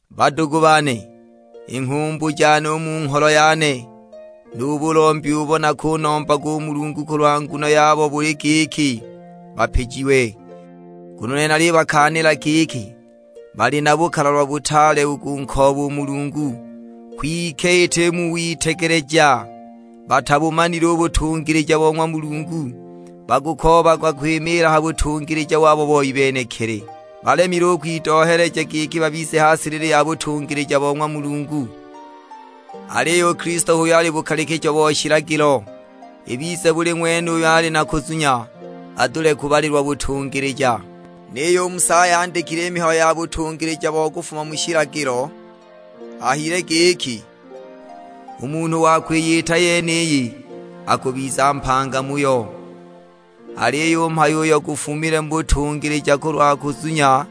Badugu bane, i nghumbu jane u mu ngholo yane, nu bulombi ubo nakunombaga u Mulungu kulwa nguno yabo buli giki, bapijiwe. Nguno u nene nalibakaanila giki bali na bukalalwa butaale u kunkooba u Mulungu, kwike iti mu witegeleja! Batabumanile u butungilija bo ng'wa Mulungu, bakukoobaga kwimiila ha butungilija wabo boi benekili; balemile u kwidohya giki babize ha silili ya butungilija bo ng'wa Mulungu. Aliyo u Kilisto h'uyo ali bukalikijo bo shilagilo, ibize buli ng'wene uyo ali na kuzunya adule kubalilwa butungilija. Niyo u Musa ayandikile i mihayo ya butungilija bo kufuma mu shilagilo; ahayile giki, "U munhu wa kwiyita i yeniyi akubiza mpanga muyo." Aliyo u mhayo uyo gufumile mu butungilija kulwa kuzunya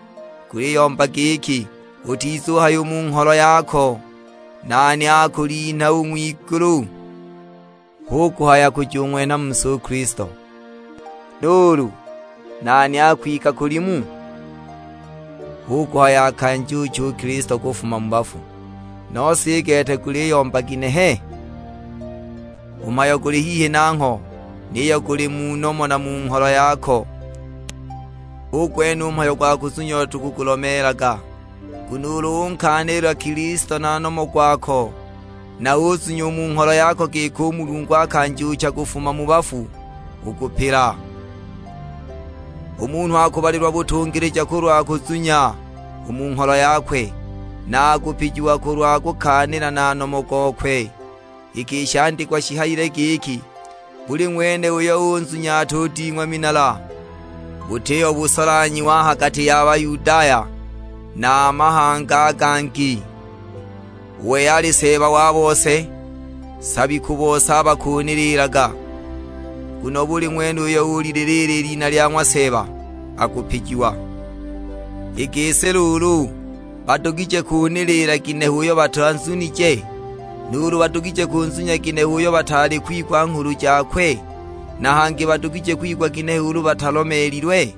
guliyomba giki, "Utizuhaya u mu ngholo yako, 'Nani akulinha u ng'wigulu?' " (Hu kuhaya kujung'wenha mu si u Kilisto). "Nuulu, 'Nani akwika kulimu?' " (Hu kuhaya akanjuuche u Kilisto kufuma mu bafu). Nose i gete guliyomba ginehe? "U mhayo guli hihi nangho, niyo guli mu nomo na mu ngholo yako." Hu gwene u mhayo gwa kuzunya uyo tukugulomeelaga. Nguno ulu unkaanila Kilisto na nomo gwako, na uzunya u mu ngholo yako giki u Mulungu akanjuucha kufuma mu bafu, ukupila. U munhu akubalilwa butungilija kulwa kuzunya u mu ngholo yakwe, na akupijiwa kulwa kukaanila na nomo gokwe. Iki i shandikwa shihayile giki, "Buli ng'wene uyo unzunya atuding'wa minala." Butiho busolanhyiwa a ha gati ya Bayudaya na a mahanga a gangi, u wei ali Seeba wa bose, nsabi ku bose abo bakaniliilaga. "Nguno buli ng'wene uyo ulililiila i lina lya ng'wa Seeba akupijiwa." I gisi luulu, badugije kuniliila ginehe uyo batanzunije? Nuulu badugije kunzunya ginehe uyo bataali kwigwa nghulu jakwe? Na hangi badugije kwigwa ginehe ulu batalomeelilwe?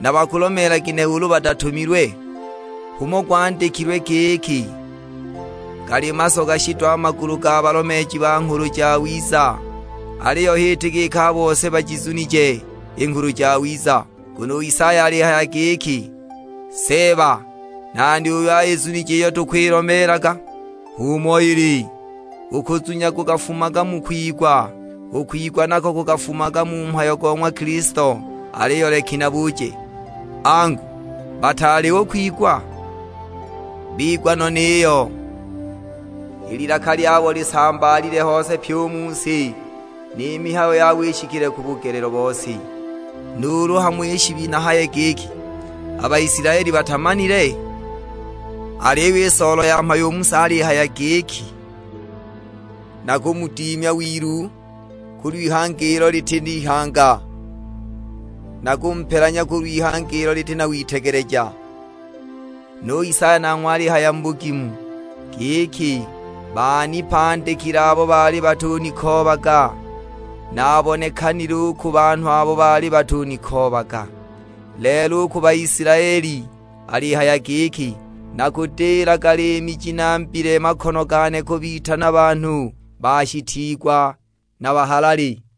Na bakulomeela ginehe ulu batatumilwe? H'umo gwandikililwe; giki, "Gali masoga shido a magulu ga balomeeji ba Nghulu Jawiza!" Aliyo h'iti giki a bose bajizunije i Nghulu Jawiza; nguno u Isaya alihaya giki, "Seeba, nani uyo ayizunije iyo tukwilomeelaga?" H'umo ili, u kuzunya gukafumaga mu kwigwa, u kwigwa nako gukafumaga mu mhayo go ng'wa Kilisto. Aliyo leki nabuje: Angu, bataali u kwigwa? Bigwa no niyo, "I lilaka lyabo lisambaalile hose pyi u mu si; ni mihayo yabo ishikile ku bugelelo bo si." Nuulu hamo shi nahaye giki, a Baisilaeli batamanile? Aliyo i soolo ya mhayo u Musa alihaya giki, "Nakumudimya wilu kulw'ihanga ilo liti ihanga; na nakumupelanya kulw'ihanga ilo liti na witegeleja." Nu Isaya nanghwe alihaya mu bugimu; giki, "Baanipandikile abo baali batunikoobaga, naabonekanile u ku banhu abo baali batunikoobaga." Lelo u ku Baisilaeli, alihaya giki, "Nakudilaga liimi ji nambile makono gane kubitana banhu bashitiigwa na bahalali!"